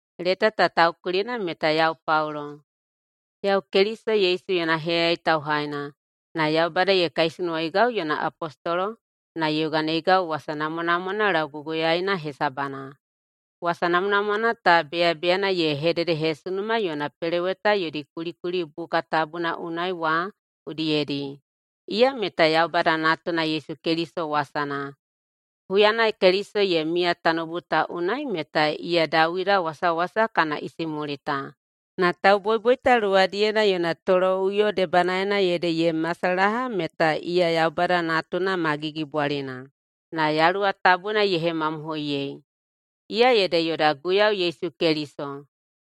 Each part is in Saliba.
[Leta ta taukulina meta] yau Paulo. Yau Keliso Yesu yona heyayai tauhaina, na Yaubada ye kaisunuwaigau yona apostolo na ye yoganeigau wasana namwanamwana lauguguyaeina hesabana. Wasa namwanamwana ta beyabeyana ye hededehesunuma yona peloweta yodi kulikuli buka tabuna unai wa udiyedi. Iya meta Yaubada Natuna Yesu Keliso wasana. Huyana Keliso ye miya tanoubu ta unai meta iya Dawida wasawasa kana isimulita, na tauboiboita luwadiyena yona toloꞌuyo debanaena ede ye masalaha meta iya Yaubada Natuna ma gigibwalina, na Yaluwa Tabuna ye hemamohoiyei. Iya ede yoda Guiyau Yesu Keliso.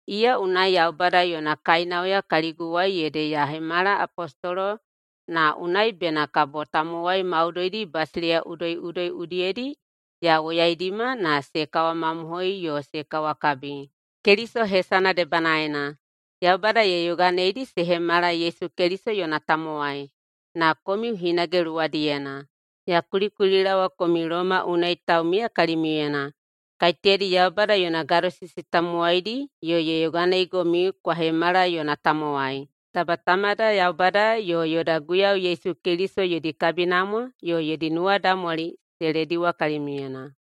Iya unai Yaubada yona kainauya kaliguwai ede ya hemala apostolo na unai bena kabo tamowai maudoidi basileiya udoiꞌudoi udiyedi ya woyaidima na se kawamamohoi yo se kawakabi, Keliso hesana debanaena. Yaubada ye yoganeidi se hemala Yesu Keliso yona tamowai. Na komiu hinage luwadiyena. Ya kulikulilaowa komiu Loma unai taumiya kalimiuyena, kaiteyadi Yaubada yona gadosisi tamowaidi yo ye yoganeigomiu kwa hemala yona tamowai. Taba Tamada Yaubada yo yoda Guiyau Yesu Keliso yodi kabinamwa yo yodi nuwadaumwali se lediwa kalimiuyena.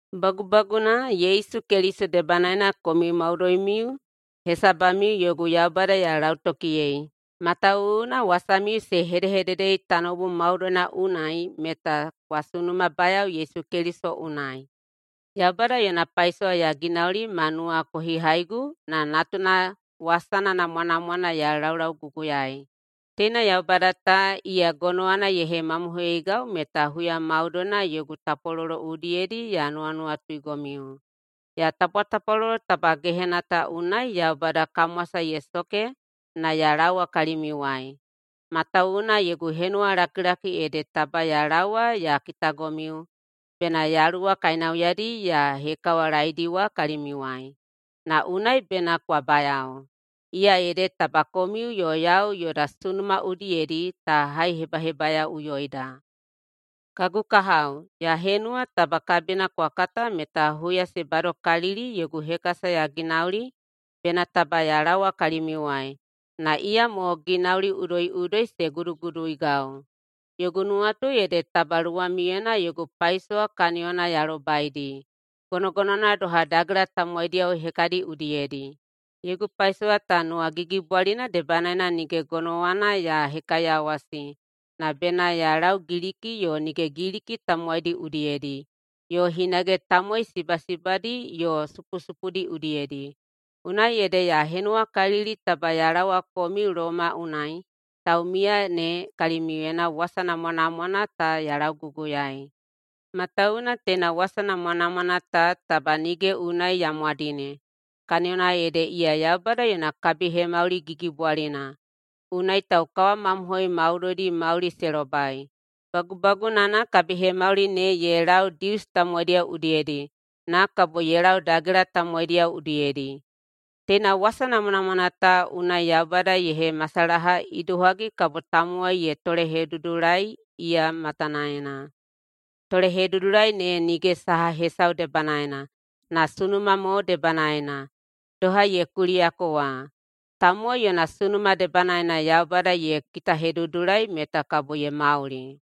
Bagubaguna, Yesu Keliso debanaena komiu maudoimiu hesabamiu yogu Yaubada ya lautokiyei, matawuwuna wasamiu se hedehededei tanoubu maudoina unai meta kwa sunumabayao Yesu Keliso unai. Yaubada yona paisowa ya ginauli ma nuwakohihaigu na Natuna wasana namwanamwana ya laulauguguyaei. Teina Yaubada ta, iya gonowana ye hemamohoiyeigau meta huya maudoina yogu tapwalolo udiyedi ya nuwanuwatuigomiu. Ya tapwatapwalolo taba gehena ta unai Yaubada kamwasa ye soke na ya laowa kalimiuwai. Matawuwuna yogu henuwa lakilakina ede taba ya laowa ya kitagomiu bena Yaluwa kainauyadi ya hekawalaeidiwa kalimiuwai, na unai bena kwa bayao, iya ede taba komiu yo yau yoda sunuma udiyedi ta haihebahebayaoꞌuyoida. Kagu kahao, ya henuwa taba kabina kwa kata meta huya se badokalili yogu hekasa ya ginauli bena taba ya laowa kalimiuwai, na iyamo ginauli udoiꞌudoi se guduguduigau. Yogu nuwatu ede taba luwamiuyena yogu paisowa kaniyona ya lobaidi, gonogonowana doha dagela tamowaidiyao hekadiyo udiyedi. Yogu paisowa ta nuwagigibwalina debanaena nige gonowana ya hekaiyawasi, na bena ya lau Giliki yo nige Giliki tamowaidi udiyedi, yo hinage tamowai sibasibadi yo supusupudi udiyedi. Unai ede ya henuwakalili taba ya laowa komiu Loma unai taumiya ne kalimiuyena wasa namwanamwana ta ya lauguguyaei. Matawuwuna teina wasa namwanamwana ta taba nige unai ya mwadine, kaniyona ede iya Yaubada yona kabihemauli gigibwalina, unai taukawamamohoi maudoidi mauli se lobai. Bagubagunana kabihemauli ne ye lau Dius tamowaidiyao udiyedi, na kabo ye lau dagela tamowaidiyao udiyedi. Teina wasa namwanamwana ta unai Yaubada ye hemasalaha idohagi kabo tamowai ye tolehedudulai iya matanaena. Tolehedudulai ne nige saha hesau debanaena, na sunuma mo debanaena. Doha ye kuliyako wa, “Tamowai yona sunuma debanaena Yaubada ye kitahedudulai meta kabo ye mauli.”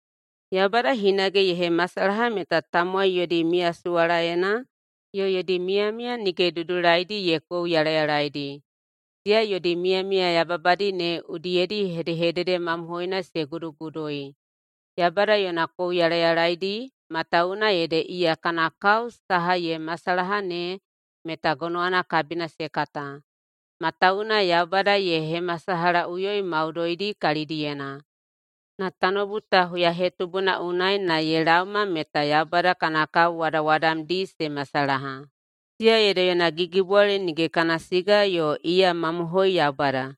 Yaubada hinage ye hemasalaha meta tamowai yodi miyasuwalaena yo yodi miyamiya nige dudulaidi ye kouyalayalaedi. Siya yodi miyamiya yababadi ne udiyedi hedehedede mamohoina se gudugudui. Yaubada [yona kouyalayalaedi] matawuwuna ede iya kana kao saha ye masalaha ne meta gonowana kabina se kata, matawuwuna Yaubada ye hemasalahaꞌuyoi maudoidi kalidiyena. Na tanoubu ta huyahetubuna unai na ye laoma meta Yaubada kana kao wadawadamdi se masalaha, siya ede yona gigibwali nige kana siga yo iya mamohoi Yaubada.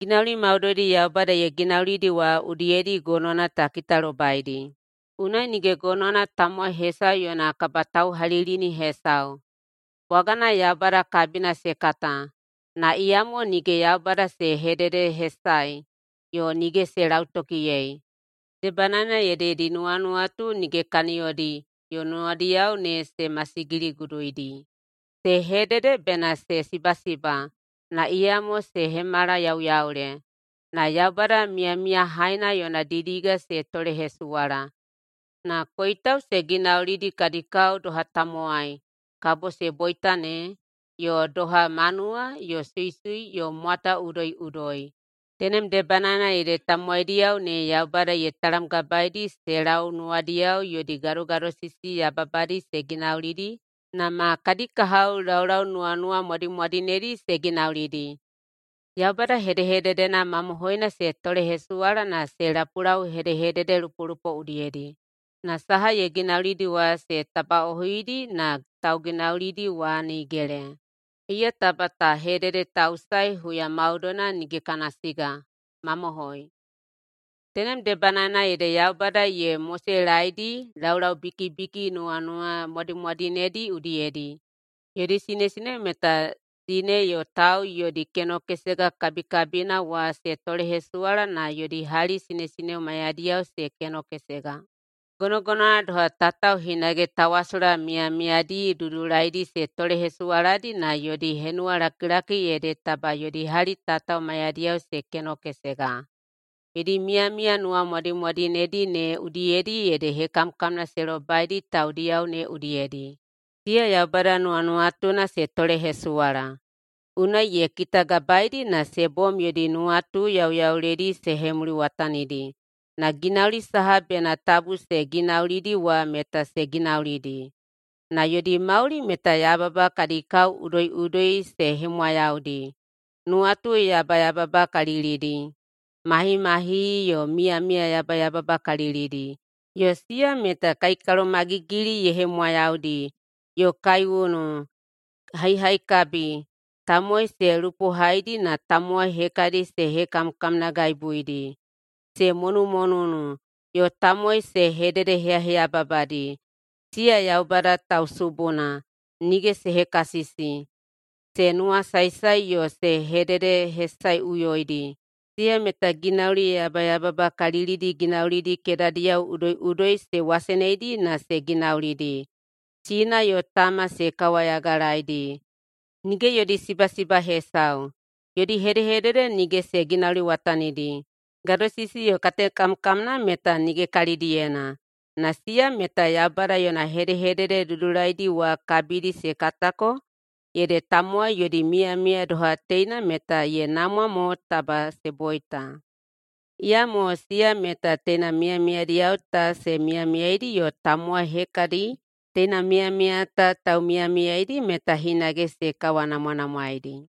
Ginauli maudoidi Yaubada ye ginaulidi wa udiyedi gonowana ta kitalobaidi. Unai nige gonowana tamowai hesau yona kabatauhalilini hesau. Bwagana Yaubada kabina se kata, na iyamo nige Yaubada se hededehesae yo nige se lautokiyei. Debanaena ede yodi nuwanuwatu nige kaniyodi yo nuwadiyao ne se masigiliguduidi. Se hedede bena se sibasiba, na iyamo se hemala yauyaule. Na Yaubada miyamiyahaina yona didiga se tolehesuwala, na koitau se ginaulidi kadi kao doha tamowai kabo se boita ne, yo doha manuwa yo suisui yo mwata udoiꞌudoi. Tenem debanaena ede tamowaidiyao ne Yaubada ye talamgabaeidi se lau nuwadiyao yodi gadogadosisi yababadi se ginaulidi na ma kadi kahao laulau nuwanuwamwadimwadinedi se ginaulidi. Yaubada hedehededena mamohoina se tolehesuwala na se lapulau hedehededelupolupo udiyedi. Na saha ye ginaulidi wa se tabaꞌohuidi na tauginaulidi wa nigele. Iya taba ta hededetausae huya maudoina nige kana siga. Mamohoi. Tenem debanaena ede Yaubada ye moselaedi laulau bikibikidi nuwanuwamwadimwadinedi udiyedi. Yodi sinesineo meta sine yo tau yodi kenokesega kabikabina wa se tolehesuwala na yodi hali sinesineo maiyadiyao se kenokesega. Gonogonowana doha, tatao hinage tawasola miyamiyadi dudulaidi se tolehesuwaladi na yodi henuwalakilaki ede taba yodi hali tatao maiyadiyao se kenokesega. Yodi miyamiya nuwanuwamwadimwadinedi ne udiyedi ede hekamkamna se lobaidi taudiyao ne udiyedi. Siya Yaubada nuwanuwatuna se tolehesuwala, unai ye kitagabaeidi na se bom yodi nuwatu yauyauledi se hemuliwatanidi na ginauli saha bena tabu se ginaulidi wa meta se ginaulidi. Na yodi mauli meta yababa kadi kao udoiꞌudoi se hemwayaudi, nuwatu yabayababakalilidi, mahimahihi yo miyamiya yabayababakalilidi, yo siya meta kaikalomagigili ye hemwayaudi, yo kaiunu, haihaikabi, tamowai se lupohaidi na tamowai hekadi se hekamkamnagaibuidi. Se monumonunu, yo tamowai se hededeheyaheyababadi. Siya Yaubada tausubuna, nige se hekasisi, se nuwasaesae yo se hededehesaeꞌuyoidi, siya meta ginauli yabayababakalilidi ginaulidi kedadiyao udoiꞌudoi se waseneidi na se ginaulidi. Sina yo tama se kawayagalaeidi, nige yodi sibasiba hesau, yodi hedehedede nige se ginauliwatanidi, gadosisi yo katekamkamna meta nige kalidiyena. Na siya meta Yaubada yona hedehedede dudulaidi wa kabidi se katako ede tamowai yodi miyamiya doha teina meta ye namwa mo taba se boita. Iyamo siya meta teina miyamiyadiyao ta se miyamiyaidi yo tamowai hekadi teina miyamiya ta taumiyamiyaeidi meta hinage se kawanamwanamwaeidi.